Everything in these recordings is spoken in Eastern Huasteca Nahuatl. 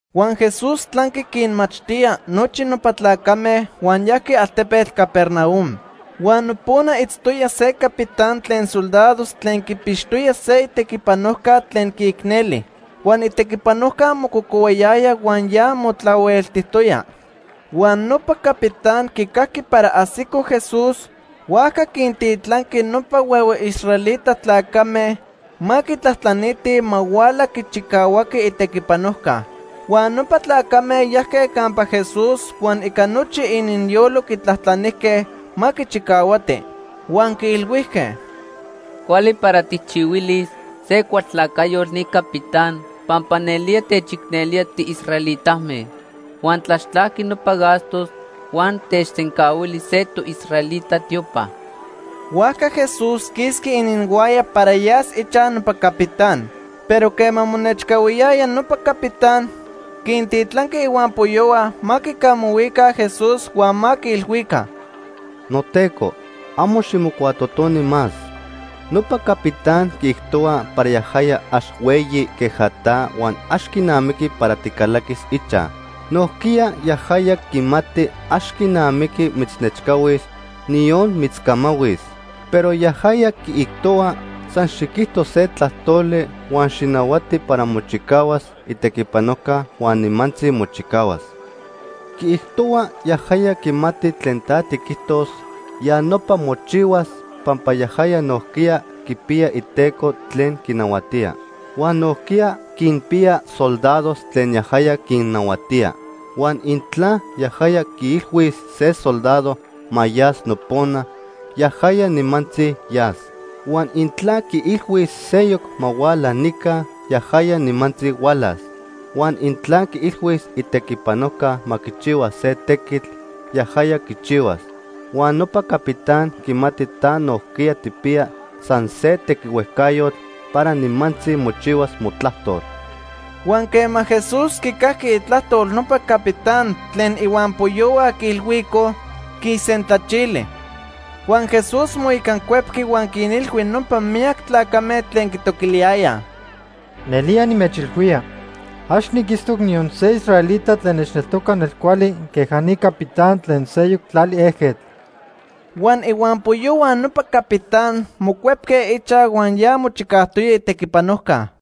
Huan Jesús tlanqui quinmachtía nochi nopa tlacame huan yajqui altepetl Capernaum. Huan nopona itztoya se capitán tlen soldados tlen quipixtoya se itequipanojca tlen quiicneli. Huan itequipanojca mococohuayaya huan ya motlahueltijtoya. Huan nopa capitán quicajqui para ajsico Jesús, huajca quintitlanqui nopa huehue israelita tlacame ma quitlajtlanitij ma huala quichicahuaqui itequipanojca. Huan nopa tlacame yajque campa Jesús huan ica nochi ininyolo quitlajtlanijque ma quichicahuati. Huan quiilhuijque: ―Cuali para tijchihuilis se cualtlacayotl ni capitán, pampa nelía techicnelía tiisraelitame. Huan tlaxtlajqui nopa gastos huan techsencahuili se toisraelita tiopa. Huajca Jesús quisqui ininhuaya para yas ichaj nopa capitán. Pero quema monechcahuiyaya, nopa capitán quintitlanqui ihuampoyohua ma quicamahuica Jesús huan ma quiilhuica: ―NoTeco, amo ximocuatotoni más. Nopa capitán quiijtohua para yajaya ax hueyi queja ta huan ax quinamiqui para ticalaquis ichaj. Nojquiya yajaya quimati ax quinamiqui mitznechcahuis, niyon mitzcamahuis. Pero yajaya quiijtohua, san xiquijto se tlajtoli huan xijnahuati para mochicahuas itequipanojca huan nimantzi mochicahuas. Quiijtohua yajaya quimati tlen ta tiquijtos, ya nopa mochihuas, pampa yajaya nojquiya quipiya iteco tlen quinahuatía. Huan nojquiya quinpiya soldados tlen yajaya quinnahuatía. Huan intla yajaya quiilhuis se soldado ma yas nopona, yajaya nimantzi yas. Huan intla quiilhuis seyoc ma huala nica, yajaya nimantzi hualas. Huan intla quiilhuis itequipanojca ma quichihua se tequitl, yajaya quichihuas. Huan nopa capitán quimati ta nojquiya tijpiya san se tequihuejcayotl para nimantzi mochihuas motlajtol. Huan quema Jesús quicajqui itlajtol nopa capitán tlen ihuampoyohua quiilhuicoj, quisentlachili. Huan Jesús moicancuepqui huan quinilhui nopa miyac tlacame tlen quitoquiliyayaj: ―Nelía nimechilhuía, ax niquitztoc niyon se israelita tlen nechneltoca nelcuali queja ni capitán tlen seyoc tlali ejquetl. Huan ihuampoyohua nopa capitán mocuepque ichaj huan ya mochicajtoya itequipanojca.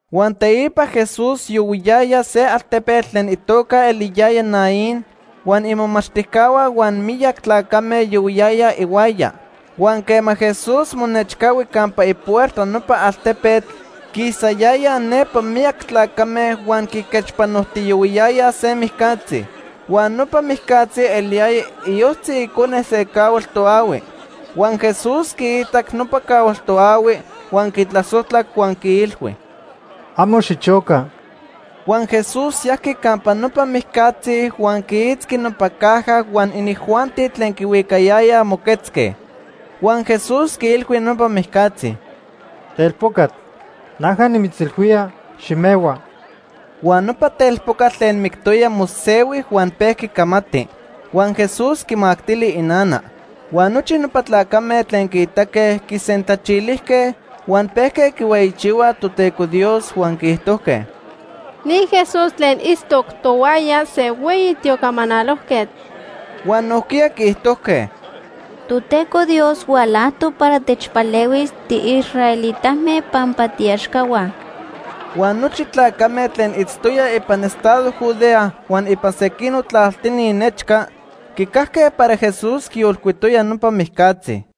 Huan teipa Jesús yohuiyaya se altepetl tlen itoca eliyaya Naín huan imomachtijcahua huan miyac tlacame yohuiyayaj ihuaya. Huan quema Jesús monechcahui campa ipuerta nopa altepetl, quisayayaj nepa miyac tlacame huan quiquechpanojtiyohuiyayaj se mijcatzi. Huan nopa mijcatzi eliyaya iyojtzi icone se cahual toahui. Huan Jesús quiitac nopa cahual toahui, huan quitlasojtlac huan quiilhui: ―Amo xichoca. Huan Jesús yajqui campa nopa mijcatzi huan quiitzqui nopa caja huan inijuanti tlen quihuicayayaj moquetzque. Huan Jesús quiilhui nopa mijcatzi: ―Telpocatl, naja nimitzilhuía, ximehua. Huan nopa telpocatl tlen mictoya mosehui huan pejqui camati. Huan Jesús quimactili inana. Huan nochi nopa tlacame tlen quiitaque quisentlachilijque, huan pejque quihueyichihuaj Toteco Dios huan quiijtojque: ―Ni Jesús tlen itztoc tohuaya, se hueyi tiocamanalojquetl. Huan nojquiya quiijtojque: ―Toteco Dios hualajtoc para techpalehuis tiisraelitame pampa tiiaxcahua. Huan nochi tlacame tlen itztoyaj ipan estado Judea huan ipan sequinoc tlaltini nechca quicajque para Jesús quiyolcuitoya nopa mijcatzi.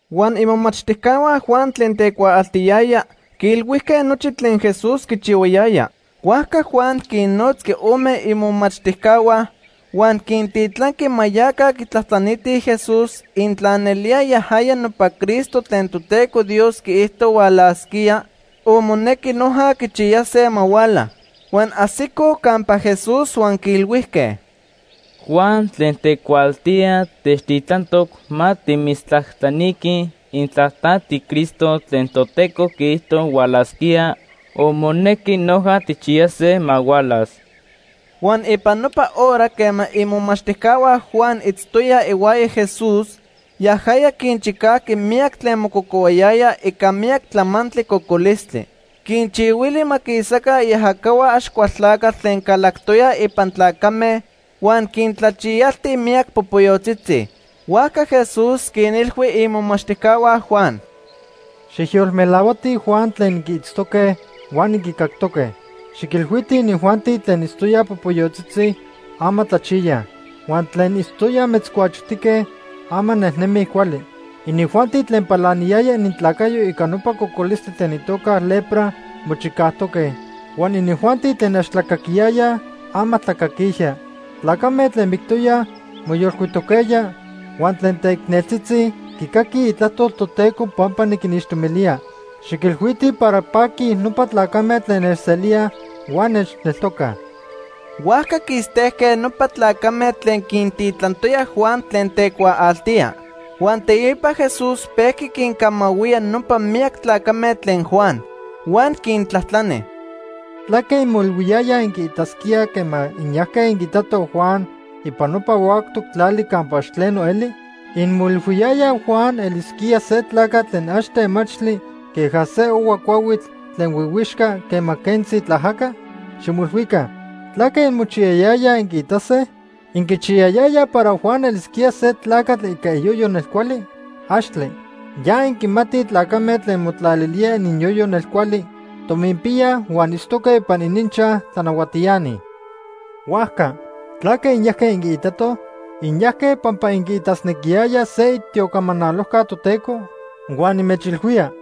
Huan imomachtijcahua Juan tlen tecuaaltiyaya quiilhuijque nochi tlen Jesús quichihuayaya. Huajca Juan quinnotzqui ome imomachtijcahua, huan quintitlanqui ma yaca quitlajtlanitij Jesús intla nelía yajaya nopa Cristo tlen Toteco Dios quiijto hualasquía o monequi noja quichiyase ma huala. Huan ajsicoj campa Jesús huan quiilhuijque: ―Juan tlen tecuaaltía techtitlantoc ma timitztlajtlaniquij intla ta tiCristo tlen Toteco quiijto hualasquía o monequi noja tijchiyase ma hualas. Huan ipan nopa hora quema imomachtijcahua Juan itztoyaj ihuaya Jesús, yajaya quinchicajqui miyac tlen mococohuayayaj ica miyac tlamantli cocolistli. Quinchihuili ma quisaca iajacahua Axcualtlacatl tlen calactoyaj ipan tlacame huan quintlachiyalti miyac popoyotzitzi. Huajca Jesús quinilhui imomachtijcahua Juan: ―Xijyolmelahuatij Juan tlen inquiitztoque huan inquicactoque. Xiquilhuitij inijuanti tlen itztoyaj popoyotzitzi, ama tlachiyaj. Huan tlen itztoyaj metzcuachotique, ama nejnemij cuali. Inijuanti tlen palaniyaya inintlacayo ica nopa cocolistli tlen itoca lepra mochicajtoque, huan inijuanti tlen ax tlacaquiyaya, ama tlacaquijya. Tlacame tlen mictoyaj moyolcuitoquejya huan tlen teicneltzitzi quicaquij itlajtol Toteco pampa niquinixtomilía. Xiquilhuitij para paquij nopa tlacame tlen nechselíaj huan nechneltocaj. Huajca quistejque nopa tlacame tlen quintitlantoya Juan tlen tecuaaltía. Huan teipa Jesús pejqui quincamahuía nopa miyac tlacame tlen Juan. Huan quintlajtlani: “¿Tlaque inmoilhuiyayaj inquiitasquíaj quema inyajque inquiitatoj Juan ipan nopa huactoc tlali campa ax tleno eli? ¿Inmoilhuiyayaj Juan elisquía se tlacatl tlen ax temachtli queja se ohua cuahuitl tlen huihuixca quema quentzi tlaajaca? ¡Ximoilhuica! ¿Tlaque inmochiyayayaj inquiitase? ¿Inquichiyayayaj para Juan elisquía se tlacatl ica iyoyo nelcuali? ¡Axtle! Ya inquimatij tlacame tlen motlalilíaj ininyoyo nelcuali, tominpíaj huan itztoque ipan ininchaj tlanahuatiani. Huajca, ¿tlaque inyajque inquiitatoj? ¿inyajque pampa inquiitasnequiyayaj se itiocamanalojca Toteco? Huan nimechilhuía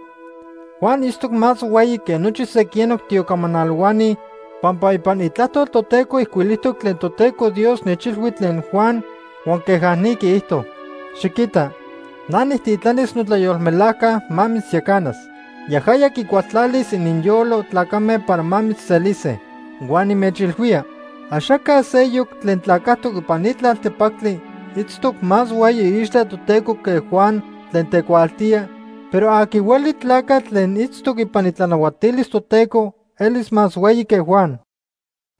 Juan itztoc más hueyi que nochi sequinoc tiocamanalohuani, pampa ipan Itlajtol Toteco ijcuilijtoc tlen Toteco Dios nechilhui tlen Juan huan queja ni quiijto: ‘Xiquita, na nijtitlanis notlayolmelajca ma mitzyacanas. Yajaya quicualtlalis ininyolo tlacame para ma mitzselise.’ Huan nimechilhuía axaca seyoc tlen tlacajtoc ipan ni tlaltepactli itztoc más hueyi iixtla Toteco que Juan tlen tecuaaltía, pero aqui hueli tlacatl tlen itztoc ipan itlanahuatilis Toteco elis más hueyi que Juan.”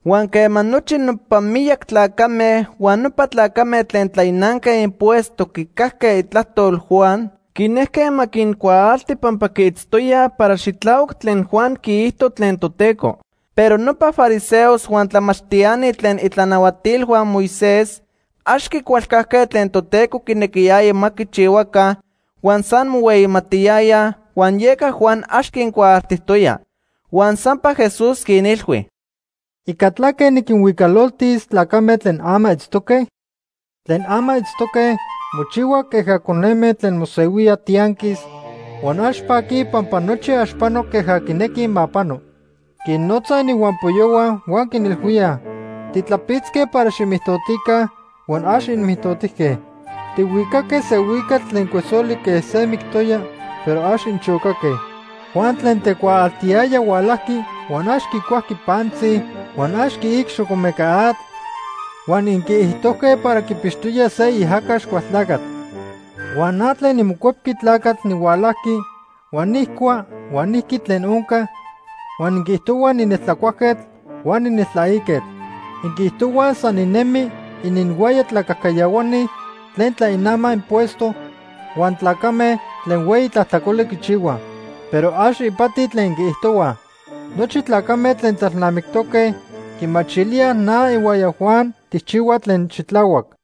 Huan quema nochi nopa miyac tlacame huan nopa tlacame tlen tlainanque impuesto quicajque itlajtol Juan, quinejque ma quincuaalti pampa quiitztoyaj para xitlahuac tlen Juan quiijto tlen Toteco. Pero nopa fariseos huan tlamachtiani tlen itlanahuatilhua Moisés ax quicualcajque tlen Toteco quinequiyaya ma quichihuaca, huan san mohueyimatiyayaj, huan yeca Juan ax quincuaaltijtoya. Huan sampa Jesús quinilhui: “¿Ica tlaque niquinhuicalotis tlacame tlen ama itztoque? Tlen ama itztoque mochihuaj queja coneme tlen mosehuíaj tianquis huan ax paquij pampa nochi ax pano queja quinequij ma pano. Quinnotzaj ininhuampoyohua huan quinilhuíaj: ‘Titlapitzque para ximijtotica, huan ax inmijtotijque. Tihuicaque se huicatl tlen cuesoli quej se mictoya, pero ax inchocaque.’ Juan tlen tecuaaltiyaya hualajqui huan ax quicuajqui pantzi huan ax quiic xocomeca atl, huan inquiijtojque para quipixtoya se iajaca Axcualtlacatl. Huan na tlen niMocuepqui Tlacatl nihualajqui huan nijcua huan niqui tlen onca, huan inquiijtohuaj nineltlacuajquetl huan nineltlaiquetl. Inquiijtohuaj san ninemi ininhuaya tlacajcayahuani tlen tlainamaj impuesto huan tlacame tlen hueyi tlajtlacoli quichihuaj. Pero ax ipati tlen inquiijtohuaj. Nochi tlacame tlen tlalnamictoque quimachilíaj na ihuaya Juan tijchihuaj tlen xitlahuac.”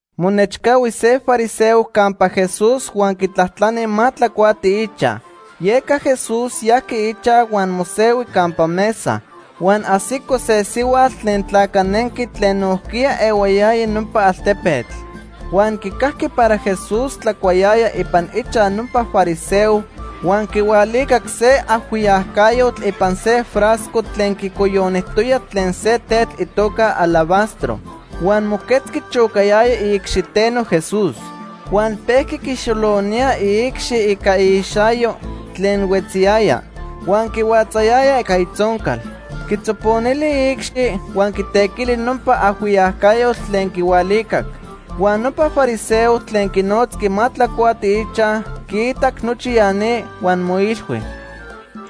Monechcahui se fariseo campa Jesús huan quitlajtlani ma tlacuati ichaj. Yeca Jesús yajqui ichaj huan mosehui campa mesa. Huan ajsico se sihuatl tlen tlacanenqui tlen nojquiya ehuayaya nopa altepetl. Huan quicajqui para Jesús tlacuayaya ipan ichaj nopa fariseo huan quihualicac se ajhuiyacayotl ipan se frasco tlen quicoyonijtoyaj tlen se tetl itoca alabastro. Huan moquetzqui chocayaya iicxiteno Jesús. Huan pejqui quixolonía iicxi ica iixayo tlen huetziyaya. Huan quihuatzayaya ica itzoncal. Quitzoponili iicxi huan quitequili nopa ajhuiyacayotl tlen quihualicac. Huan nopa fariseo tlen quinotzqui ma tlacuati ichaj quiitac nochi ya ni huan moilhui: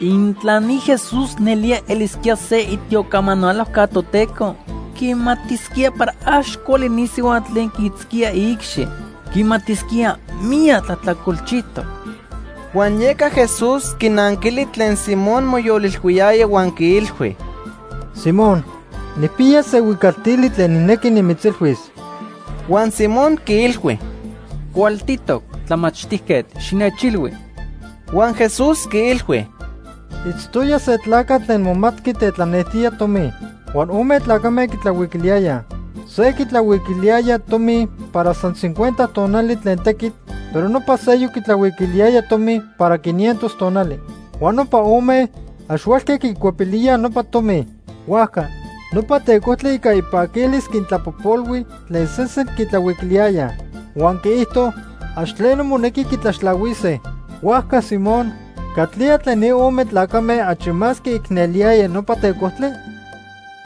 “Intla ni Jesús nelía elisquía se itiocamanalojca Toteco, quimatisquía para ax cuali ni sihuatl tlen quiitzquía iicxi. Quimatisquía miyac tlajtlacolchijtoc.” Huan yeca Jesús quinanquili tlen Simón moyolilhuiyaya huan quiilhui: ―Simón, nijpiya se huicaltili tlen nijnequi nimitzilhuis. Huan Simón quiilhui: ―Cualtitoc, Tlamachtijquetl, xinechilhui. Huan Jesús quiilhui: ―Itztoya se tlacatl tlen momatqui tetlanejtía tomi. Huan ome tlacame quitlahuiquiliyayaj. Se quitlahuiquiliyaya tomi para san cincuenta tonali tlen tequitl, pero nopa seyoc quitlahuiquiliyaya tomi para quinientos tonali. Huan nopa ome ax huelque quicuepilíaj nopa tomi. Huajca nopa tecojtli ica ipaquilis quintlapojpolhui tlen sesen quitlahuiquiliyayaj. Huan quiijto ax tleno monequi quitlaxtlahuise. Huajca Simón, ¿catlía tlen ni ome tlacame achi más quiicneliyaya nopa tecojtli?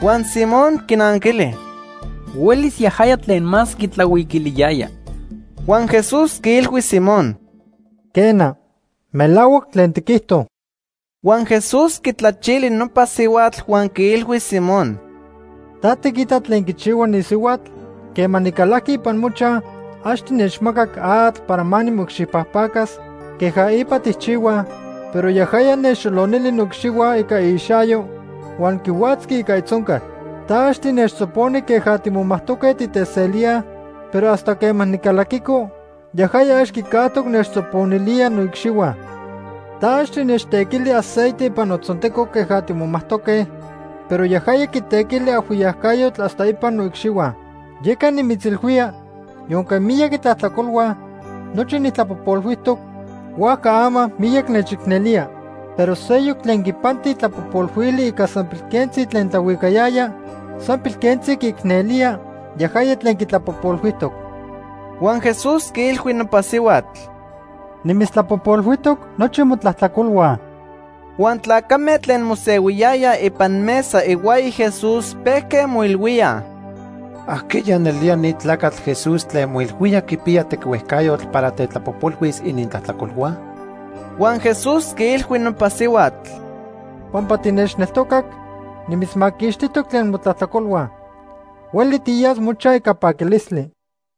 Huan Simón quinanquili: ―Huelis yajaya tlen más quitlahuiquiliyaya. Huan Jesús quiilhui Simón: ―Quena, melahuac tlen tiquijto. Huan Jesús quitlachili nopa sihuatl huan quiilhui Simón: ―¿Ta tiquita tlen quichihua ni sihuatl? Quema nicalajqui ipan mochaj, ax tinechmacac atl para nimoicxipajpacas queja ipa tijchihuaj, pero yajaya nechxolonili noicxihua ica iixayo huan quihuatzqui ica itzoncal. Ta ax tinechtzoponi queja timomajtoque titeselíaj, pero hasta quema nicalaquico, yajaya ax quicajtoc nechtzoponilía noicxihua. Ta ax tinechtequili aceite ipan notzonteco queja timomajtoque, pero yajaya quitequili ajhuiyacayotl hasta ipan noicxihua. Yeca nimitzilhuía, yonque miyac itlajtlacolhua, nochi nijtlapojpolhuijtoc, huajca ama miyac nechicnelía. Pero seyoc tlen quipanti tlapojpolhuili ica san pilquentzi tlen tlahuicayaya, san pilquentzi quiicnelía yajaya tlen quitlapojpolhuijtoc. Huan Jesús quiilhui nopa sihuatl: ―Nimitztlapojpolhuijtoc nochi motlajtlacolhua. Huan tlacame tlen mosehuiyayaj ipan mesa ihuaya Jesús pejque moilhuíaj: ―¿Ajqueya nelía ni tlacatl Jesús tlen moilhuía quipiya tequihuejcayotl para tetlapojpolhuis inintlajtlacolhua? Huan Jesús quiilhui nopa sihuatl: ―Pampa tinechneltocac, nimitzmaquixtijtoc tlen motlajtlacolhua. Hueli tiyas mochaj ica paquilistli.